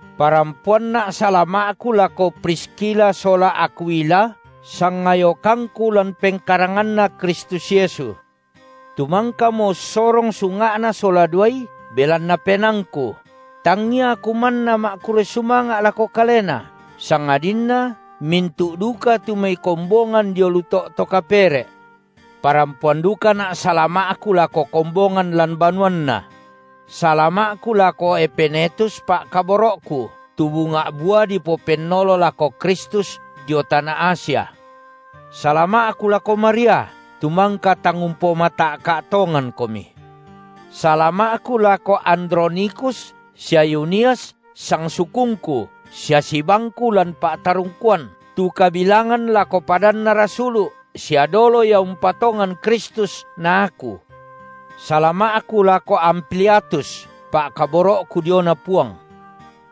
Parampoanna’ salama’ku lako Priskila sola Akwila, sangayokangku lan pengkaranganNa Kristus Yesu; tu mangkamo ussorong sunga’na sola duai belanna penaangku; tangia aku manna ma’kurre sumanga’ lako kalena, sangadinna mintu’ duka tu mai kombongan dio lu to’ to kapere’. Parampoan dukana’ salama’ku lako kombongan lan banuanna. Salama’ku lako Epenetus, pa’kaboro’ku, tu bunga’ bua dipopennolo lako Kristus dio tana Asia. Salama’ku lako Maria, tu mangka tang umpomata’ka’ tongankomi. Salama’ku lako Andronikus sia Yunias, sangsukungku sia sibangku lan pa’tarungkuan, tu kabilangan lako padanna rasulu’, sia dolo ia umpatongan Kristus na aku. Salama’ku lako Ampliatus, pa’kaboro’ku diona Puang.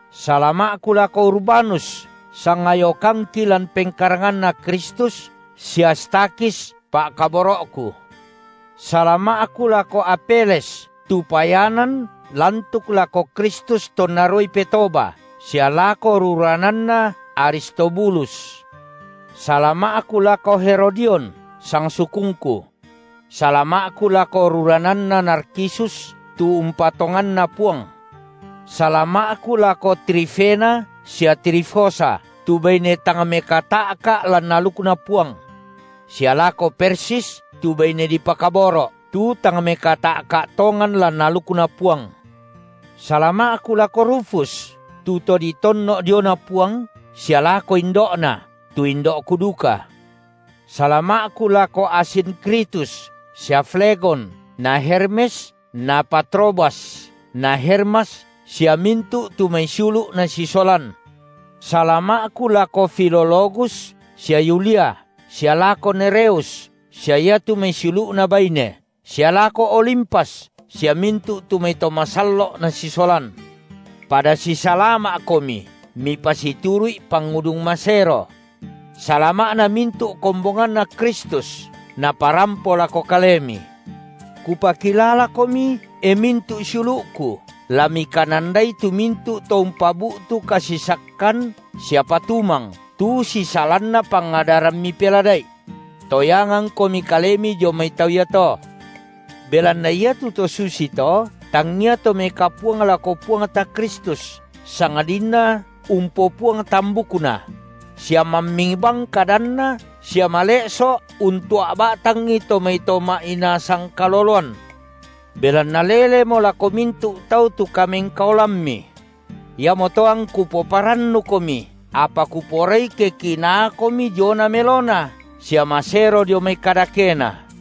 Salama’ku lako Urbanus, sangayokangki lan pengkaranganNa Kristus, sia Stakhis pa’kaboro’ku. Salama’ku lako Apeles, tu payanan lantuk lako Kristus tonna ruai petoba, sia lako rurananna Aristobulus. Salama’ku lako Herodion, sangsukungku. Salama’ku lako rurananna Narkisus tu umpatonganna Puang. Salama’ku lako Trifena sia Trifosa, tu baine tang mekata’ka’ lan alukNa Puang. Sia lako Persis, tu baine dipakaboro’, tu tang mekata’ka’ tongan lan alukNa Puang. Salama’ku lako Rufus, tu to ditonno’ diona Puang, sia lako indo’na, tu indo’ku duka. Salama’ku lako Asinkritus sia Flegon, na Hermes na Patrobas, na Hermas sia mintu’ tu mai siulu’ nasisolan. Salama’ku lako Filologus sia Yulia, sia lako Nereus, sia iatu mai siulu’na baine, sia lako Olimpas, sia mintu’ tu mai to masallo’ nasisolan. Pada sisalama’komi mipasituru’i pangudung masero. Salama’na mintu’ kombonganNa Kristus naparampo lako kalemi. Kupakilalakomi, e mintu’ siulu’ku, la mikanandai tu mintu’ to umpabu’tu kasisakkan sia patumang tu sisalanna pangadaran mipelada’i. Toyangangkomi kalemi dio mai tau iato. Belanna iatu to susito, tangia to mekapuang lako Puangta Kristus, sangadinna umpopuang tambukna; sia mamming bang kadanna sia male’so’ untua’ ba’tangi to mai to ma’inaa sangkaloloan. Belanna lelemo lako mintu’ tau tu kamengkaolammi. Iamoto angku poparannukomi, apa kuporai ke kinaakomi diona melona sia masero dio mai kadakena.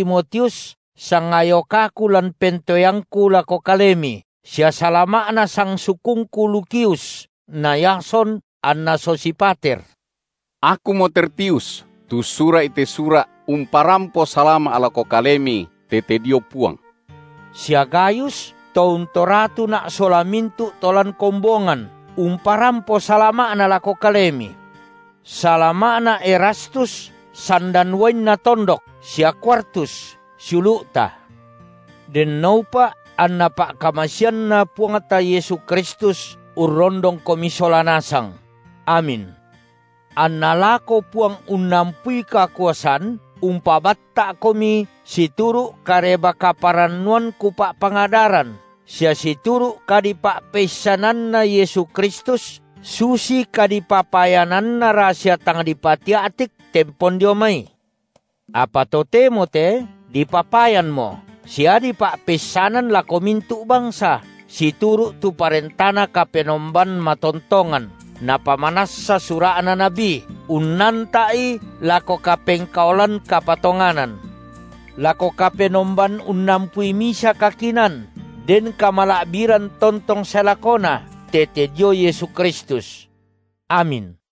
Salama’na Timotius, sangayokaku lan pentoeangku, lako kalemi, sia salama’na sangsukungku Lukius na Yason anna Sosipater. Akumo Tertius, tu ussura’i te sura’ umparampo salama’ lako kalemi tete dio Puang. Sia Gayus, tu untoratuna’ sola mintu’ to lan kombongan, umparampo salama’na lako kalemi. Salama’na Erastus sandan uainna tondok, sia Kwartus, siulu’ta. (Denno upa’ anna pa’kamaseanNa Puangta Yesu Kristus urrondongkomi sola nasang! Amin.) Anna lako Puang unnampui kakuasan umpabatta’komi situru’ Kareba-kaparannuan kupa’pangadaran sia situru’ kadipa’peissananna Yesu Kristus, susi kadipapayananna rasia tang dipatia’tik tempon dio mai, apa totemo te dipapayanmo sia dipa’peissanan lako mintu’ bangsa, situru’ tu parentaNa Kapenomban matontongan, napamanassa sura’na nabi, unnanta’i lako kapengkaolan kapatonganan, lako Kapenomban unnampui misa kakinaan, den kamala’biran tontong sae lakona, tete dio Yesu Kristus. Amin.